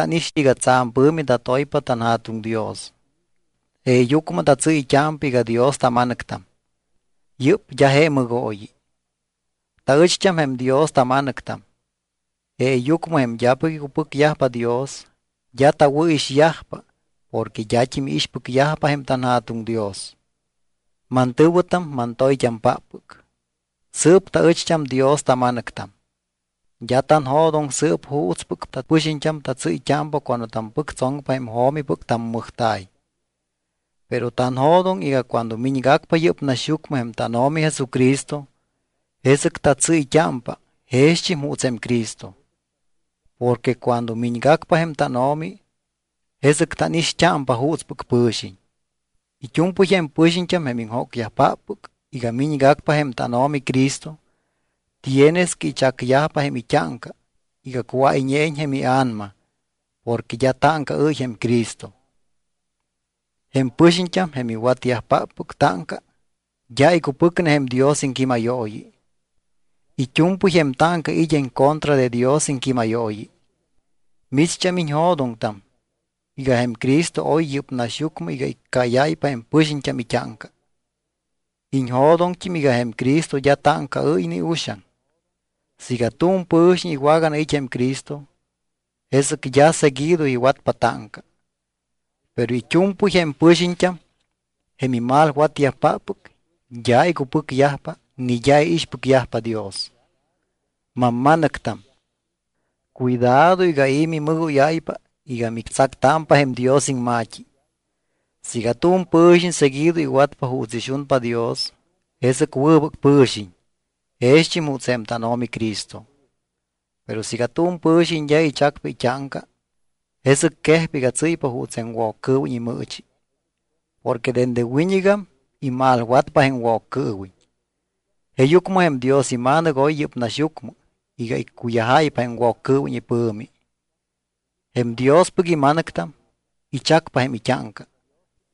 I̱xɨ iga tsa̱m pɨ̱mi tatoypa tanJa̱tuŋ Dios. Jeeyucmɨ tatsɨ́yt́ámpa iga Dios tama̱nɨctam. Yɨ́p d́a je mɨgooyi. Taɨcht́am jém Dios tama̱nɨctam. Jeeyucmɨ jém d́apɨc icupɨcyajpa Dios d́a tawɨ̱ixyajpa porque d́at́im iixpɨcyajpa jém tanJa̱tuŋ Dios. Mantɨ̱wɨtam mantoyt́ampáppɨc, sɨɨp taɨcht́am Dios tama̱nɨctam. D́a tanjo̱doŋ sɨɨp juutspɨc tapɨxiñt́am tatsɨ́yt́ámpa cuando tampɨctsoŋpa jém jo̱mipɨc tammɨjta̱y. Pero tanjo̱doŋ iga cuando miñgacpa yɨ́p naxyucmɨ jém tánO̱mi Jesucristo, jesɨc tatsɨ́yt́ámpa jext́im juuts jém Cristo. Porque cuando miñgacpa jém tánO̱mi, jesɨc tánixt́ámpa juutspɨc pɨ̱xiñ. It́u̱mpɨy jém pɨxiñt́am jém iŋjócyajpáppɨc iga miñgacpa jém tánO̱mi Cristo, tienes que ichacyajpa jém it́áŋca iga cuáyñeiñ jém ia̱nama porque d́a táŋcaɨ́y jém Cristo. Jém pɨxiñt́am, jém iwatyajpáppɨc táŋca, d́a icupɨcne jém Dios iŋquímayooyi. It́u̱mpɨy jém táŋca it́ en contra de Dios iŋquímayooyi. Micht́am iñjo̱doŋtam iga jém Cristo oy yɨ́p naxyucmɨ iga iccáyáypa jém pɨxiñt́am it́áŋca. Iñjo̱doŋt́im iga jém Cristo d́a táŋcaɨ́y ni uxaŋ. Siiga tu̱m pɨ̱xiñ iwaganait́ jém Cristo, jesɨc d́a seguido iwatpa táŋca. Pero it́u̱mpɨy jém pɨxiñt́am jém imalwatyajpáppɨc d́a icupɨcyajpa ni d́a iixpɨcyajpa Dios. Mamma̱nɨctam, cuidado iga i̱ mimɨgóyáypa iga mictsactámpa jém Dios iŋma̱t́i. Siiga tu̱m pɨ̱xiñ seguido iwatpa juuts ixunpa Dios, jesɨc wɨbɨc pɨ̱xiñ, jext́im juuts jém tánO̱mi Cristo. Pero siiga tu̱m pɨ̱xiñ d́a ichacpa it́áŋca, jesɨc quejpa iga tsɨ́ypa juuts jém Woccɨɨwiñ imɨɨchi. Porque dende wiñɨgam imalwatpa jém Woccɨɨwiñ. Jeeyucmɨ jém Dios iMa̱nɨc oy yɨ́p naxyucmɨ iga iccuyajáypa jém Woccɨɨwiñ ipɨ̱mi. Jém Diospɨc ima̱nɨctam ichacpa jém it́áŋca.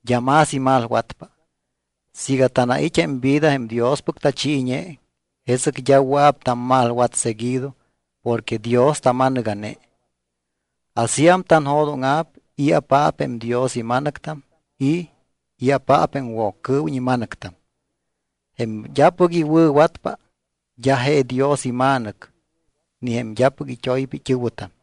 D́a más imalwatpa. Siiga tanait́ jém vida jém Diospɨc tachiiñe, jesɨc d́a wɨa̱p tammalwat seguido porque Dios tama̱nɨga̱ne. Asíam tanjo̱dóŋa̱p i̱apaap jém Dios ima̱nɨctam y i̱apaap jém Woccɨɨwiñ ima̱nɨctam. Jém d́apɨc iwɨ̱watpa d́a je Dios ima̱nɨc ni jém d́apɨc it́oypa it́ɨ̱wɨtam.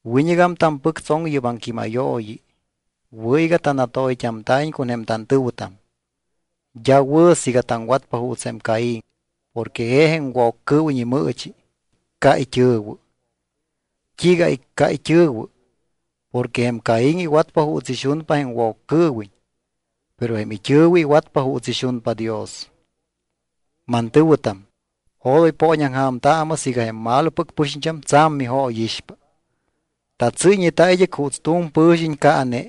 Wiñɨgam tampɨctsoŋ yɨ́p aŋquímayooyi: Wɨ̱ iga tanatoyt́amta̱iñ con jém tantɨ̱wɨtam. D́a wɨ̱ siiga taŋwatpa juuts jém Caín, porque je jém Woccɨɨwiñ imɨɨchi, icca it́ɨ̱wɨ. ¿T́iiga icca it́ɨ̱wɨ? Porque jém Caín iwatpa juuts ixunpa jém Woccɨɨwiñ, pero jém it́ɨ̱wɨ iwatpa juuts ixunpa Dios. Mantɨ̱wɨtam, odoy pooñaŋja̱mtaamɨ siiga jém malopɨc pɨxiñt́am tsa̱m mijóyixpa. Tatsɨ́yñeta id́ɨc juuts tu̱m pɨ̱xiñ caane,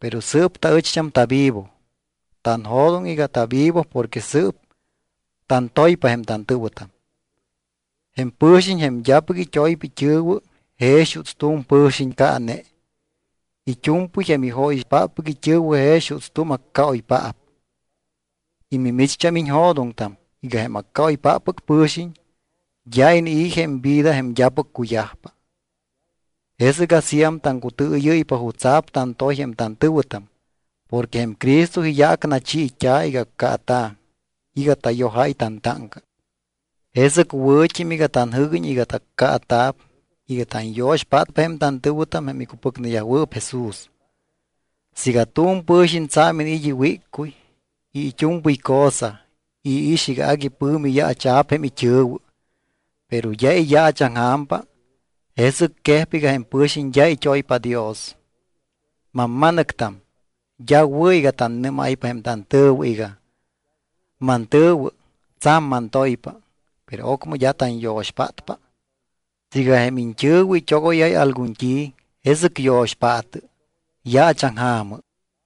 pero sɨɨp taɨcht́am tavivo. Tanjo̱doŋ iga tavivo porque sɨɨp tantoypa jém tantɨ̱wɨtam. Jém pɨ̱xiñ jém d́apɨc it́oypa it́ɨ̱wɨ jex juuts tu̱m pɨ̱xiñ caane. It́u̱mpɨy jém ijóyixpáppɨc it́ɨ̱wɨ jex juuts tu̱m accaoypaap. Y micht́am iñjo̱doŋtam iga jém accaoypáppɨc pɨ̱xiñ d́a inii̱ jém vida jém d́apɨc cuyajpa. Jesɨc asíam taŋcutɨɨyɨ́ypa jutsa̱p tantoy jém tantɨ̱wɨtam porque jém Cristo iyaac nachiit́a̱ iga accaata̱ iga tayojáy tantáŋca. Jesɨc wɨ̱t́im iga tanjɨ́guiñ iga taccaata̱p iga tanyo̱xpátpa jém tantɨ̱wɨtam jém icupɨcneyajwɨɨp Jesús. Siiga tu̱m pɨ̱xiñ tsa̱m iniit́ iwíccuy y it́u̱mpɨy cosa y iix iga pɨ̱mi yaacha̱p jém it́ɨ̱wɨ, pero d́a iyaachaŋja̱mpa, jesɨc quejpa iga jém pɨ̱xiñ d́a it́oypa Dios. Mamma̱nɨctam, d́a wɨ̱ iga tannɨ́máypa jém tantɨ̱wɨ iga: Mantɨ̱wɨ, tsa̱m mantoypa, pero ocmɨ d́a tanyo̱xpátpa. Siiga jém iñt́ɨ̱wɨ it́ogóyáy algun t́i, jesɨc yo̱xpaatɨ, yaachaŋja̱mɨ.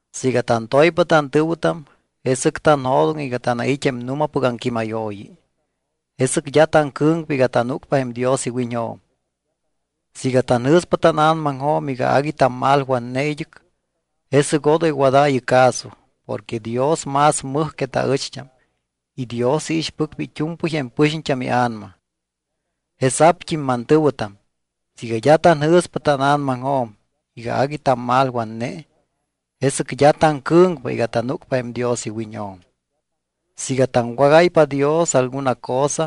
Siiga tantoypa tantɨ̱wɨtam, jesɨc tanjo̱doŋ iga tanait́ jém nu̱mapɨc aŋquímayooyi. Jesɨc d́a taŋcɨ̱ŋpa iga tanúcpa jém Dios iwiñjo̱m. Siiga tanjɨ̱spa tána̱namaŋjo̱m iga agui tammalwatne id́ɨc, jesɨc odoy wadaayɨ caso porque Dios más mɨj que taɨcht́am y Dios iixpɨcpa it́u̱mpɨy jém pɨxiñt́am ia̱nama. Jesa̱pt́im, mantɨ̱wɨtam, siiga d́a tanjɨ̱spa tána̱namaŋjo̱m iga agui tammalwatne, jesɨc d́a taŋcɨ̱ŋpa iga tanúcpa jém Dios iwiñjo̱m. Siiga taŋwágáypa Dios alguna cosa,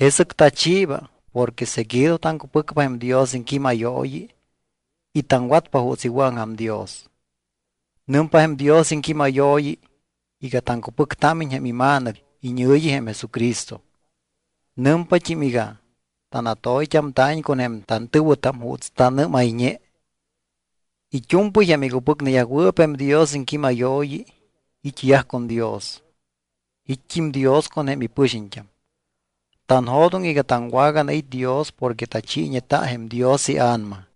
jesɨc tachiiba porque seguido taŋcupɨcpa jém Dios iŋquímayooyi y taŋwatpa juuts iwɨ̱aŋja̱m Dios. Nɨmpa jém Dios iŋquímayooyi iga taŋcupɨctámiñ jém iMa̱nɨc iñɨ̱yi, jém Jesucristo. Nɨmpat́im iga tanatoyt́amta̱iñ con jém tantɨ̱wɨtam juuts tanɨ́mayñe. It́u̱mpɨy jém icupɨcneyajwɨɨp jém Dios iŋquímayooyi it́yaj con Dios. It́t́im Dios con jém ipɨxiñt́am. Tanjo̱doŋ iga taŋwaganait́ Dios porque tachiiñeta jém Dios iA̱nama.